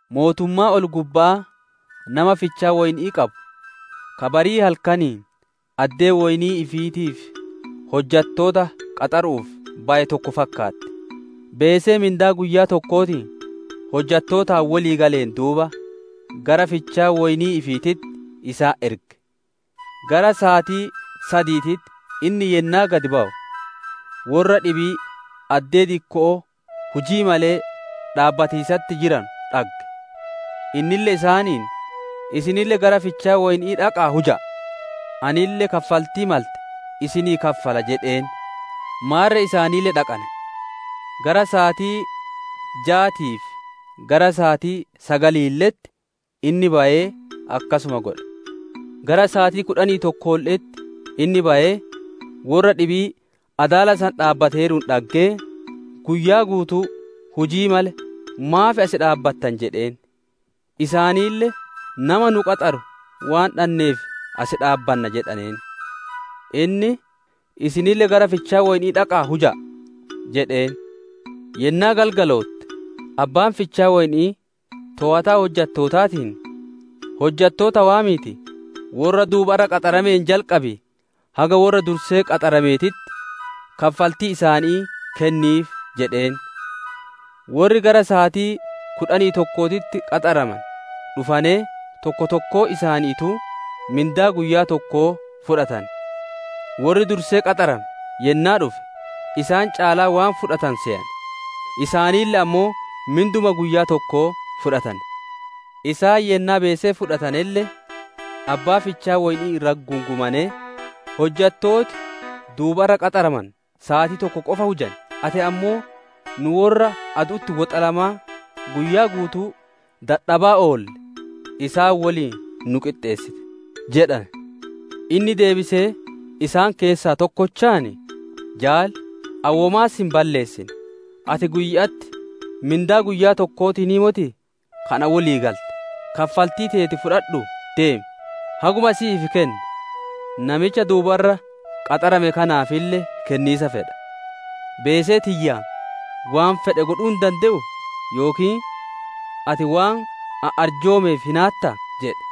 «Mootummaan ol-gubba'aa nama fichaa woyni'ii qabu, ka barii halkaniin addee woynii ifiitiif hojjattoota qaxaru'uuf baye tokko fakkaatti. Beesee mindaa guyyaa tokkootiin hojjattootaan wolii galeen duuba, gara fichaa woynii ifiititti isaan erge. Gara saatii sadiititti inni yennaa gad bawu, worra dhibii addee dikko'oo hujii malee dhaabbatiisatti jiranu dhagge; innille isaaniin, ‹Isinille gara fichaa woyni'ii dhaqa'aa huja'a; anille kaffaltii malte isinii kaffala› jedheen. Maarre isaanille dhaqane. Gara saatii jaatii fi gara saatii sagaliille'etti inni bayee akkasuma godhe. Gara saatii kudhanii tokkoolle'etti inni bayee worra dhibii adaala san dhaabbateeruun dhaggee, ‹Guyyaa guutuu hujii malee maaf as dhaabbattan?› jedheen. Isaanille, ‹Nama nu qaxaru waan dhanneef as dhaabbanna› jedhaneen. Inni, ‹Isinille gara fichaa woyni'ii dhaqa'aa huja'a› jedheen. Yennaa galgalootte, abbaan fichaa woyni'ii toowataa hojjattootaatiin, ‹Hojjattoota waamiitii, worra duubarra qaxarameen jalqabii haga worra dursee qaxarameetitti, kaffaltii isaanii kenniif› jedheen. Worri gara saatii kudhanii tokkootitti qaxaramane dhufanee, tokko tokkoon isaaniituu mindaa guyyaa tokkoo fudhatane. Worri dursee qaxarame yennaa dhufe, isaan caalaa waan fudhatanu seyane; isaanille ammoo minduma guyyaa tokkoo fudhatane. Isaan yennaa beesee fudhatanelle, abbaa fichaa woyni'ii irratti gungumanee, ‹Hojjattooti duubarra qaxaramane saatii tokko qofa hujane, ati ammoo nu worra adu'utti woxalamaa guyyaa guutuu dadhabaa oolle isaan woliin nu qixxeessite› jedhane. Inni deebisee isaan keessaa tokkochaan, ‹Jaali, ani womaa si hin balleessine; ati guyya'atti mindaa guyyaa tokkootiin motii ka anaan wolii galte? Kaffaltii teeti fudhadhuu deemi; haguma si'iif kenne namicha duubarra qaxarame kanaafille kenniisa fedha. Beesee tiyyaan waan fedhe godhuu hin dande'uu? Yookiin ati waan ani arjoomeef hinaattaa?› jedhe» jedhe.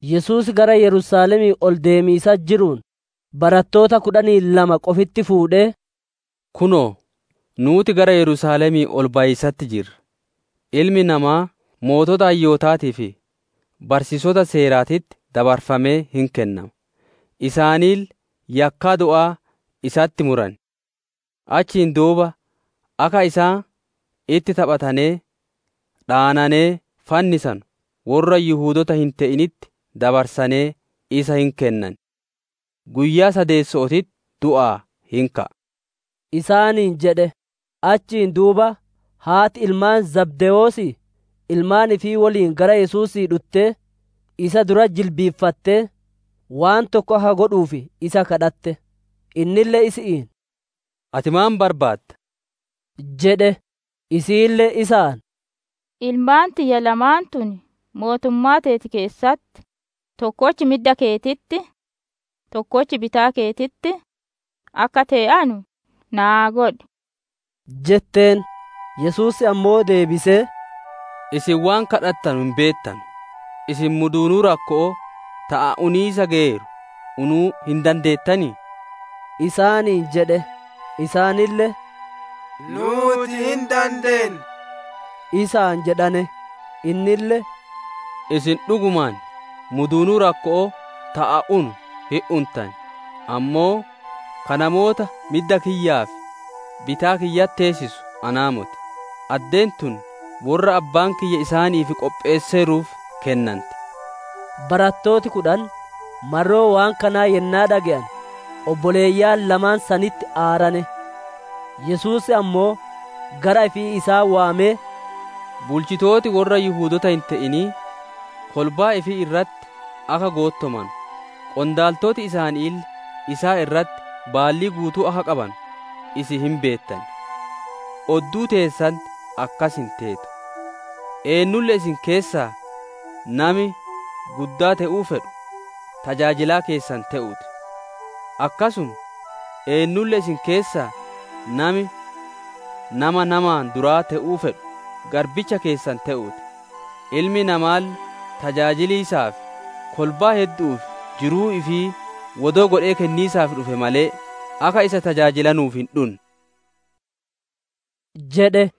Yesuus gara Yerusaalemii ol deemiisatti jiruun, barattoota kudhanii lamaa qofitti fuudhee, «Kunoo, nuuti gara Yerusaalemii ol bayiisatti jirra, Ilmi Namaa sooreyyii hayyootaatii fi barsiisota Seeraatitti dabarfamee hin kennama; isaanille yakkaa du'aa isatti muran. Achiin duuba akka isaan itti taphatanee, dhaananee fannisanu worra Yihudoota hin te'initti dabarsanee isa hin kennan. Guyyaa sadeesso'ootitti du'aa hin ka'a» isaaniin jedhe. Achiin duuba haati ilmaan Zabdewoosii ilmaan ifii woliin gara Yesuusii dhuttee, isa duratti jilbiiffattee, waan tokko akka godhuuf isa gaafatte. Innille isi'iin, «Ati maan barbaadda?» jedhe. Isiille isaan, «Ilmaan tiyya lamaan tun mootummaa teeti keessatti tokkochi midda keetitti, tokkochi bitaa keetitti, akka tee'anu naa godhi» jetteen. Yesuus ammoo deebisee, «Isin waan gaafatanu hin beettanu. Isin muduunuu rakko'oo ta ani uniisa geyeeru unuu hin dandeettanii?» isaaniin jedhe. Isaanille, «Nuuti hin dandeenna» isaan jedhane. Innille, «Isin dhugumaan muduunuu rakko'oo ta ani unu hin untan, ammoo ka namoota midda kiyyaa fi bitaa kiyyatti teessisu anaa moti; addeen tun worra Abbaan kiyya isaaniif qopheesseeruuf kennanti» isaaniin jedhe. Barattooti kudhan marroo waan kanaa yennaa dhage'ane, obboleeyyan lamaan sanitti aarane. Yesuus ammoo gara ifii isaan waamee, «Bulchitooti worra Yihudoota hin te'inii kolbaa ifii irratti akka goottomanu, qondaaltoti isaaniille isaan irratti baallii guutuu akka qabanu isin hin beettan. Odduu teessanitti akkas hin teetu; eennulle isin keessaa nami guddaa te'uu fedhu tajaajilaa keessan te'uu ti; akkasuma eennulle isin keessaa nami nama namaan duraa te'uu fedhu garbicha keessan te'uu ti; Ilmi Namaalle tajaajiliisaa fi kolbaa heddu'uuf jiruu ifii wodoo godhee kenniisaaf dhufe malee, akka isa tajaajilanuuf hin dhunne» jedhe.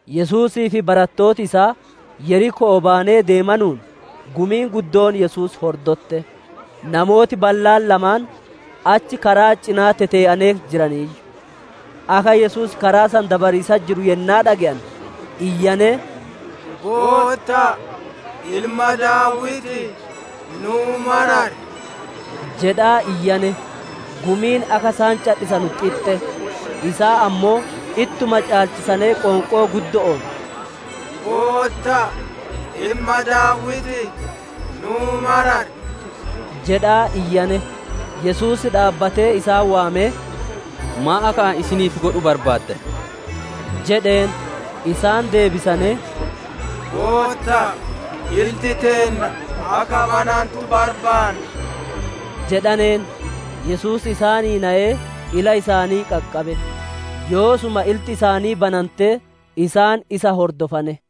Yesuusii fi barattooti isaa Yeriko'oo bayanee deemanuun, gumiin guddoon Yesuus hordotte. Namooti ballaan lamaan achi karaa cinaa tetee'anee jiraniiyyu. Akka Yesuus karaa san dabariisatti jiru yennaa dhage'ane, iyyanee, «Gootta'a, Ilma Daawitii, nuu marari!» jedhaa iyyane. Gumiin akka isaan cadhisanu xixxe; isaan ammoo ittuma caalchisanee qoonqoo guddo'oon, «Gootta'a, Ilma Daawitii, nuu marari!» jedhaa iyyane. Yesuus dhaabbatee isaan waamee, «Maan akka ani isiniif godhu barbaaddan?» jedheen. Isaan deebisanee, «Gootta'a, ilti teenna akka banantu barbaanna» jedhaneen. Yesuus isaanii nayee ila isaanii qaqqabe; yoosuma ilti isaanii banantee, isaan isa hordofane.